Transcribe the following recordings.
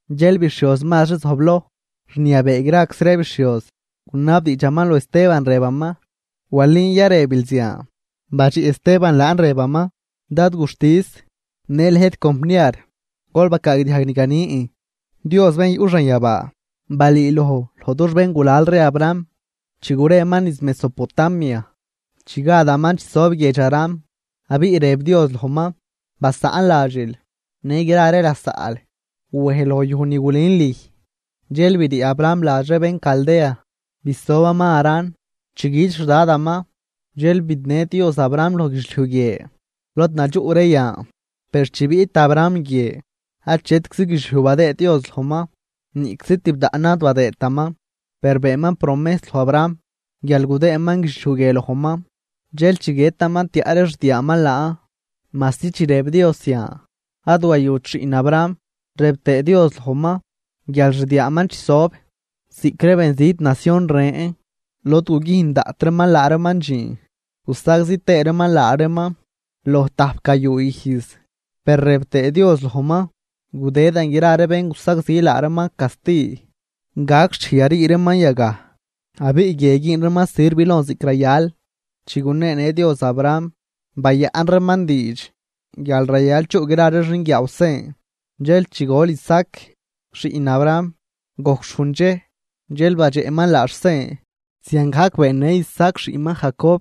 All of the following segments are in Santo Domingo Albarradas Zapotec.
Dxel bixhioz mazri zojbloj rniabee graczi ree bixhioz, gunabdiidxaman loj Esteban, rëbaman: ―¿Walin ya rëbil zian? Badxiꞌ Esteban laan, rëbaman: ―Dad guxtis, në lëjt compniar, gol bacaagdiajg ni ganin. Dios bén yuꞌ xanyabaa balüüloj loj dux béngulal ree Abraham, chi gureman niz Mesopotamia chi gadaman chisob guiedx Harán. Abiꞌ rëb Dios lojman: “Basaꞌn ladxil në gra ree lasaꞌl, wej loj yuj ni gulün lüj.” Dxel brii Abraham ladx ree bén Caldea bisobaman Harán. Chi güt xDadaman, dxel bidnë Dios Abraham loj guidxliuj guie lod nadxuꞌ ree yan. Per chi biꞌt Abraham guie, achetczi guidxliuj badëëd Dios lojman, niꞌczi tibdaꞌnan ad badëëtaman. Per beenman promejs loj Abraham guial gudëëman guidxliuj guie lojman, dxel chi guiëtaman tiaꞌ ree xdiaaman laan, majsi chi rëb Dios zian, ad wayut xiꞌn Abraham. Rëb tëë Dios lojman guial xdiaaman chisob ziꞌc ree benzit nacion ren, lod gugüjn daꞌt reeman laa reeman dxiin gusagzi tëë reeman laa reeman loj tajp gayuu ijz. Per rëb tëë Dios lojman: “Gudëdan gra ree bén gusagzi laa reeman casti, gac xchej yarii reeman yagaj abiꞌ guie güün reeman sirv lon ziꞌc rayal.” Chi guneenë Dios Abraham, bayaꞌn reeman diidx guial rayal chuꞌ gra ree xinguiaaw sen. Zeel chi gol Isaac xiꞌn Abraham, gojc xhujn dxej, dxel badxeꞌman laax sen. Ziangajc beennë Isaac xiꞌnman Jacob,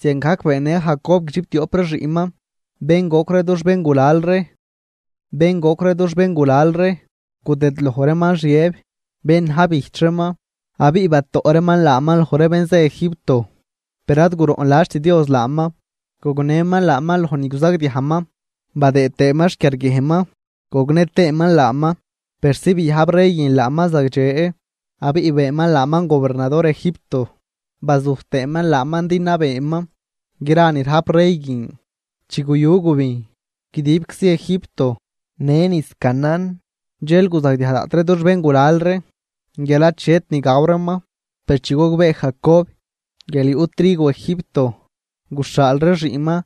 ziangajc beennë Jacob guidxiptioꞌp ree xiꞌnman, bén goc ree dux béngulal ree. ’Bén goc ree dux béngulal ree gudëdloj reeman Xiëb bén na̱j bijch reeman, abiꞌ batoꞌ reeman laaman loj ree bén zë Egipto, per ad guroꞌnladxt Dios laaman, gognëman laaman loj ni guzagdiajman badëë tëëman xquiarguiejnman, gognë tëëman laaman persi biajb rey guin laaman zagdxe, abiꞌ beenman laaman gobernador Egipto, bazuj tëëman laaman din nabeeman gra ni rajp rey guin. ’Chi guyu gubijn guidibczi Egipto në niz Canaán, dxel guzagdiaj daꞌt ree dux béngulal ree guial achet ni gaw reeman. Per chi gogbee Jacob guial yuꞌ trigo Egipto, guxhaal ree xiꞌnman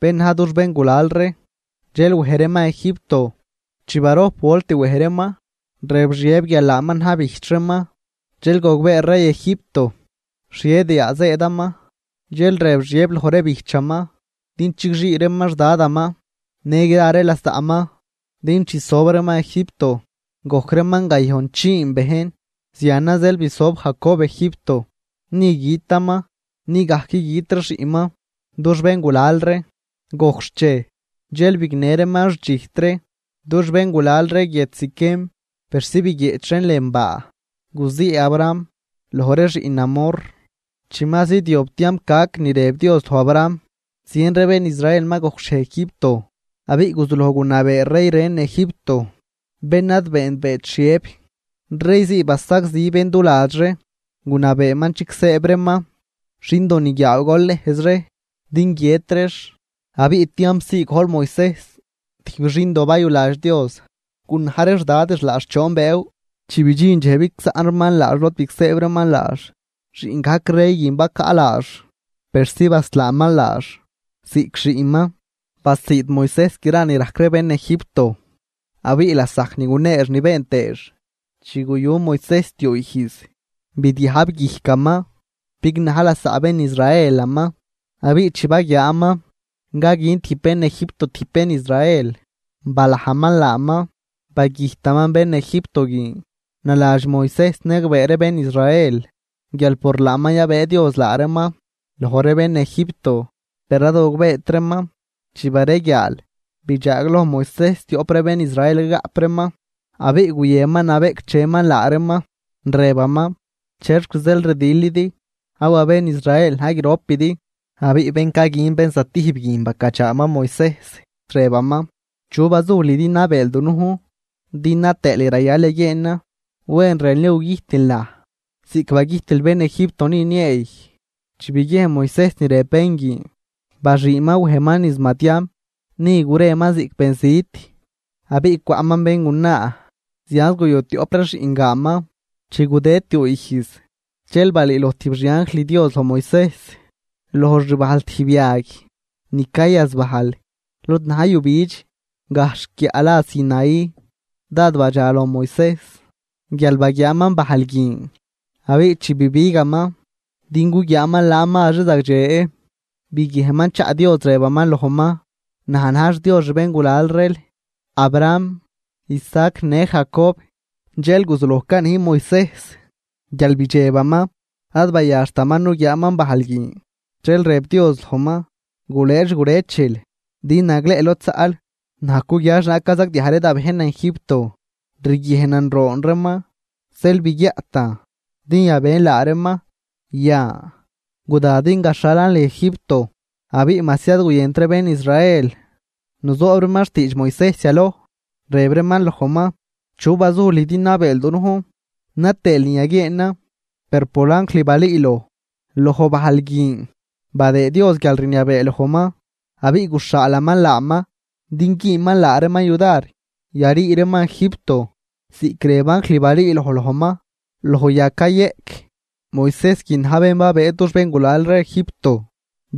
bén na̱j dux béngulal ree, dxel wej reeman Egipto. Chi barojp volt wej reeman, rëb Xiëb guial laaman na̱j bijch reeman, dxel gogbee rey Egipto xhie diaa zëëdaman. Dxel rëb Xiëb loj ree bijchaman din chigxii reeman xDadaman në gra ree lasaꞌman din chisob reeman Egipto. Gojc reeman gayojnchiin bejn. Zianan zeel bisob Jacob Egipto, ni gütaman ni gajc güt ree xiꞌnman, dux béngulal ree. Gojc xchej dxel bignë reeman xdxijt ree dux béngulal ree guiedx Siquem, persi biguieꞌch reen lën baa guzii Abraham loj ree xiꞌn Hamor. ’Chi ma zidyob tiamp gac ni rëb Dios loj Abraham, zien ree bén Israel ma gojcxhiej Egipto. Abiꞌ guzuloj gunabee rey ren Egipto, bén ad beenbeet Xiëb. Rey zii basagzi bén du ladx ree, gunabeeman chigsëëb reeman xindo niguiaaw golnejz ree din guiët reex. Abiꞌ tiamp zii gojl Moisejs, tijb xindo bayuladx Dios. Gunaj ree xdadix laax choon bëëw. Chi bidxin dxej bigsaꞌn reeman laax lod bigsëëb reeman laax, xiꞌn gajc rey guin bacaꞌ laax, persi baslaaman laax ziꞌc xiꞌnman. Basiid Moisejs gra ni rajc ree bén Egipto, abiꞌ lasajc ni guneex ni been tëëx. ’Chi guyu Moisejs tiuu ijz, bidyajb guijcaman bignaj lasaꞌ bén Israelaman. Abiꞌ chi baguiaaman caguin tijb bén Egipto tijb bén Israel, balajman laaman, bagüjtaman bén Egipto guin. Naladx Moisejs niagbee ree bén Israel guial por laaman yabëë Dios laa reeman loj ree bén Egipto, per ad gogbeet reeman. Chi bareguiaal, bidxaagloj Moisejs tioꞌp ree bén Israel cagaꞌp reeman, abiꞌ guyënman nabeꞌcdxeman laa reeman, rëbaman: “¿Chexc zeel rdilidi? Awa bén Israel na̱j gropidi.” Abiꞌ bén caguin bén zatijb guin bacadxaaman Moisejs, rëbaman: “¿Chu bazuj lüj din nabeel dunujn, din na tëël ni rayal yaguieenan? ¿Wen rënl ya gugüjtil naj ziꞌc bagüjtil bén Egipto ni nieey?” Chi biguiejn Moisejs ni rëb bén guin, baxüünman wejman niz Madián. Ni gureman ziꞌc benzit, abiꞌ cwaꞌman béngunaa, zianz guyu tioꞌp ree xiꞌngaanman. ’Chi gudëd tiuu ijz, dxel balüüloj tijb xi anjl Dios loj Moisejs loj xbajl tijb yag ni cayazbajl lod na̱j yujbidx, gajxh guiaꞌ la Sinaí. Dád badxa loj Moisejs guial baguiaaman bajl guin. Abiꞌ chi bibigaman din guguiaaman laan mazri zagdxe, biguiejnman chaꞌ Dios rëbaman lojman: “Naj na̱j xDios xbéngulal reel, Abraham, Isaac në Jacob.” Dxel guzuloj canij Moisejs guial bidxebaman, ad bayaxtaman nuguiaaman bajl guin. Dxel rëb Dios lojman: “Gulëë xgurëchil, din nagleꞌ lod zaꞌl. Naj cuguia xhienaag cazagdiaj ree da bejnan Egipto, riguiejnan roon reeman zeel biguiaꞌtan din yabën laa reeman. Yan, guda din gaxhalan lüj Egipto.” ’Abiꞌ majsi ad guyënt ree bén Israel nuzoob reeman xtiidx Moisejs yaloj, rëb reeman lojman: “¿Chu bazuj lüj din nabeel dunujn na tëël ni yaguieenan?” Per por anjl balüüloj loj bajl guin, badëëd Dios guialrniabee lojman, abiꞌ guxhaalaman laaman din güünman laa reeman yudar yarii reeman Egipto, ziꞌc rëb anjl balüüloj lojman loj yag cayeꞌc. Moisejs guin na̱j bén babëë dux béngulal ree Egipto,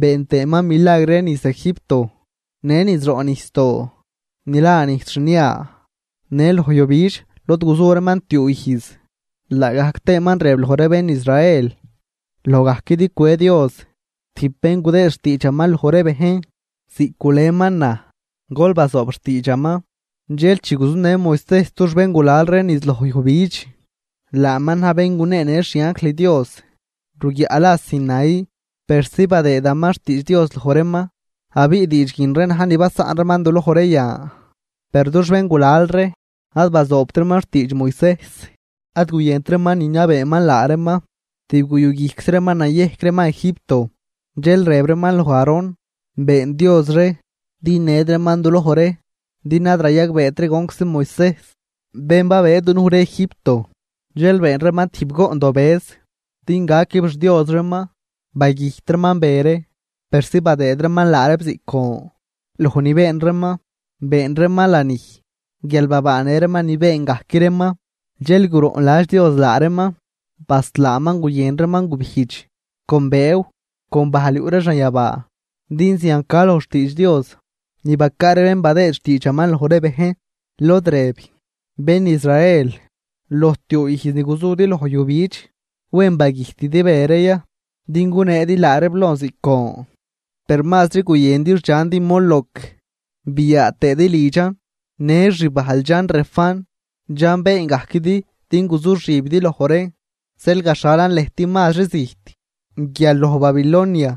been tëëman milagr ree niz Egipto, në niz roꞌ nijsdoo ni la Nijs Xnia, në loj yujbidx lod guzu reeman tiuu ijz. Laagajc tëëman rëb loj ree bén Israel: “Loj gajquidi cwe Dios tijb bén gudëëd xtiidxaman loj ree bejn ziꞌc guleman naj. Gol bazoob xtiidxaman.” Dxel chi guzunë Moisejs dux béngulal ree niz loj yujbidx, laaman na̱j bén guneenë xi anjl Dios ruguiaꞌ la Sinaí, persi badëëman xtiidx Dios loj reeman, abiꞌ diidx guin ree na̱j ni basaꞌn reeman duloj ree yan. ’Per dux béngulal ree ad bazoobt reeman xtiidx Moisejs. Ad guyënt reeman niniabeeman laa reeman, tib guyuguijczi reeman nayejc reeman Egipto. Dxel rëb reeman loj Aarón: “Been dios ree, din ned reeman du loj ree, din ad rayagbeet ree gonczi Moisejs bén babëë dunuj ree Egipto.” Dxel been reeman tijb goꞌndobëz din gaquib xdios reeman. Bagüjt reeman be ree persi badëëd reeman laa reeb ziꞌc gon loj ni been reeman, been reeman lanij guial babaanë reeman ni been gajc reeman. Dxel guroꞌnladx Dios laa reeman, baslaaman guyën reeman gubijdx con bëëw con bajl yuꞌ ree xanyabaa. Din zian ca loj xtiidx Dios ni bacaa ree bén badëëd xtiidxaman loj ree bejn, lod rëb: Bén Israel, loj tiuu ijz ni guzudi loj yujbidx, ¿wen bagüjtidi be ree ya din guneedi laa reeb lon ziꞌc gon? Per mazri guyëndi xdxandi Moloc biaa tëëdi lidxan, në xbajl dxan Refán, dxan been gajquidi din guzuxibidi loj reen. Zeel gaxhalan lëjt mazri zijt guial Babilonia.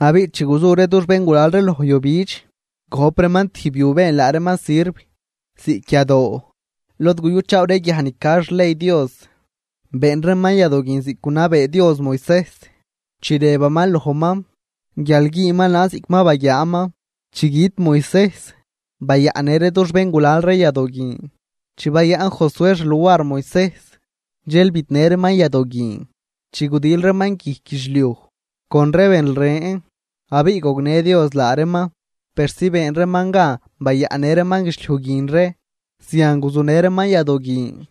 ’Abiꞌ chi guzu ree dux béngulal ree loj yujbidx, gojp reeman tijb yu been laa reeman sirv ziꞌc yadoo, lod guyuchaaw ree guiaj ni ca xley Dios. Been reeman yadoo guin ziꞌc gunabee Dios Moisejs, chi rëbaman lojman guial güünman laan ziꞌc ma baguiaaman. Chi güt Moisejs, bayaꞌnnë ree dux béngulal ree yadoo guin. Chi bayaꞌn Josué xluar Moisejs, dxel bidnë reeman yadoo guin chi gudil reeman guijc guidxliuj con ree bén ren, abiꞌ gognë Dios laa reeman persi been reeman gan bayaꞌnnë reeman guidxliuj guin ree. Zian guzunë reeman yadoo guin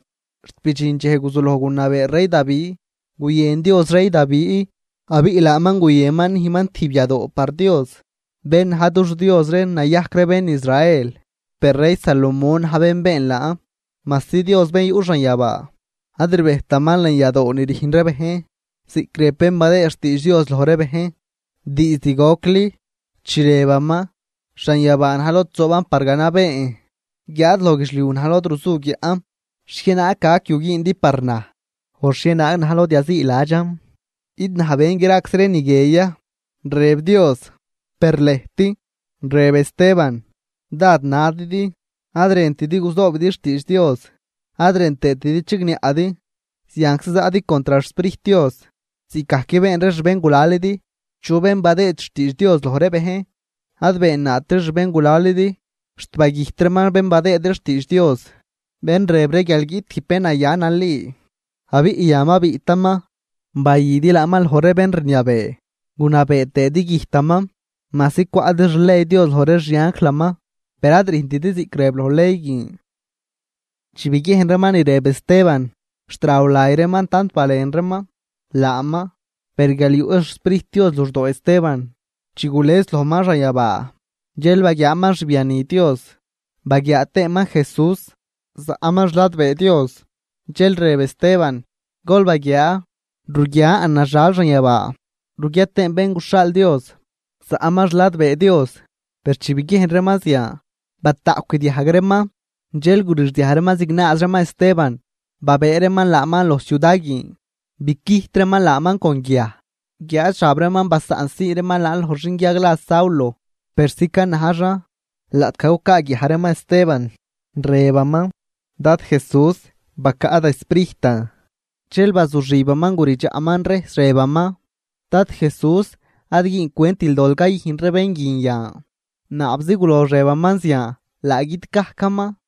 xt bidxin dxej guzuloj gunabee rey Davi. Guyën Dios rey Davi, abiꞌ laaman guyënman nüjnman tijb yadoo par Dios, bén na̱j dux Dios ree nayajc ree bén Israel. Per rey Salomón na̱j bén been laan, majsi Dios bén yuꞌ xanyabaa ad rbejtaman lën yadoo ni rüjn ree bejn, ziꞌc rëb bén badëëd xtiidx Dios loj ree bejn diizd gocli, chi rëbaman: Xanyabaa na̱j lod zooban par ganabeen, guiáad loj guidxliuj na̱j lod ruzu guiaꞌn. ¿Xhienaag gac yu güündi par naj? ¿O xhienaag na̱j lod yaziiladxan? ¿Id naj ben graczi ree ni guie ya?, rëb Dios. ’Per lëjt ―rëb Esteban ―dád nadidi, ad rëntidi guzoobidi xtiidx Dios, ad rën tëëtidi chigniaꞌdi, zianczi zaꞌdi contr xSprijt Dios, ziꞌcgajc been ree xbéngulalidi. ¿Chu bén badëëd xtiidx Dios loj ree bejn ad beennaat ree xbéngulalidi? Xt bagüjt reeman bén badëëd ree xtiidx Dios bén rëb ree guial guiꞌt tijb bén naya nali. Abiꞌ yan ma biꞌtaman, bayüdi laaman loj ree bén rniabee, gunabee tëëdi güjtaman. Majsi cwaꞌdi xley Dios loj ree xi anjlaman, per ad rüjntidi ziꞌc rëb loj ley guin. Chi biguiejn reeman ni rëb Esteban, xt raw lay reeman tant balen reeman laaman. Per guial yuꞌ xSprijt Dios luxdoo Esteban, chi gules lojman xanyabaa, dxel baguiaaman xbiani Dios baguiaa tëëman Jesús zaꞌman xladbee Dios. Dxel rëb Esteban: ―¡Gol baguiaa! Ruguian naxal xanyabaa, ruguia tëën Bén guxhaal Dios zaꞌman xladbee Dios. Per chi biguiejn reeman zian, bataꞌcw guidiajg reeman, dxel gurixdiaj reeman zignaaz reeman Esteban, babëë reeman laaman loj ciuda guin, bicüjt reeman laaman con guiaj, guiáad xab reeman basaꞌnsii reeman loj xinguiag la Saulo persi canajxan. Laꞌtgaj cucaaguiaj reeman Esteban, rëbaman: ―Dad Jesús, bacaꞌ da sprijtan. Dxel bazuxibaman guridxaꞌman rejs, rëbaman: ―Dad Jesús, ad güüncwentil dol cayüjn ree bén guin yan. Naabczi gulox rëbaman zian, laa güt gajcaman.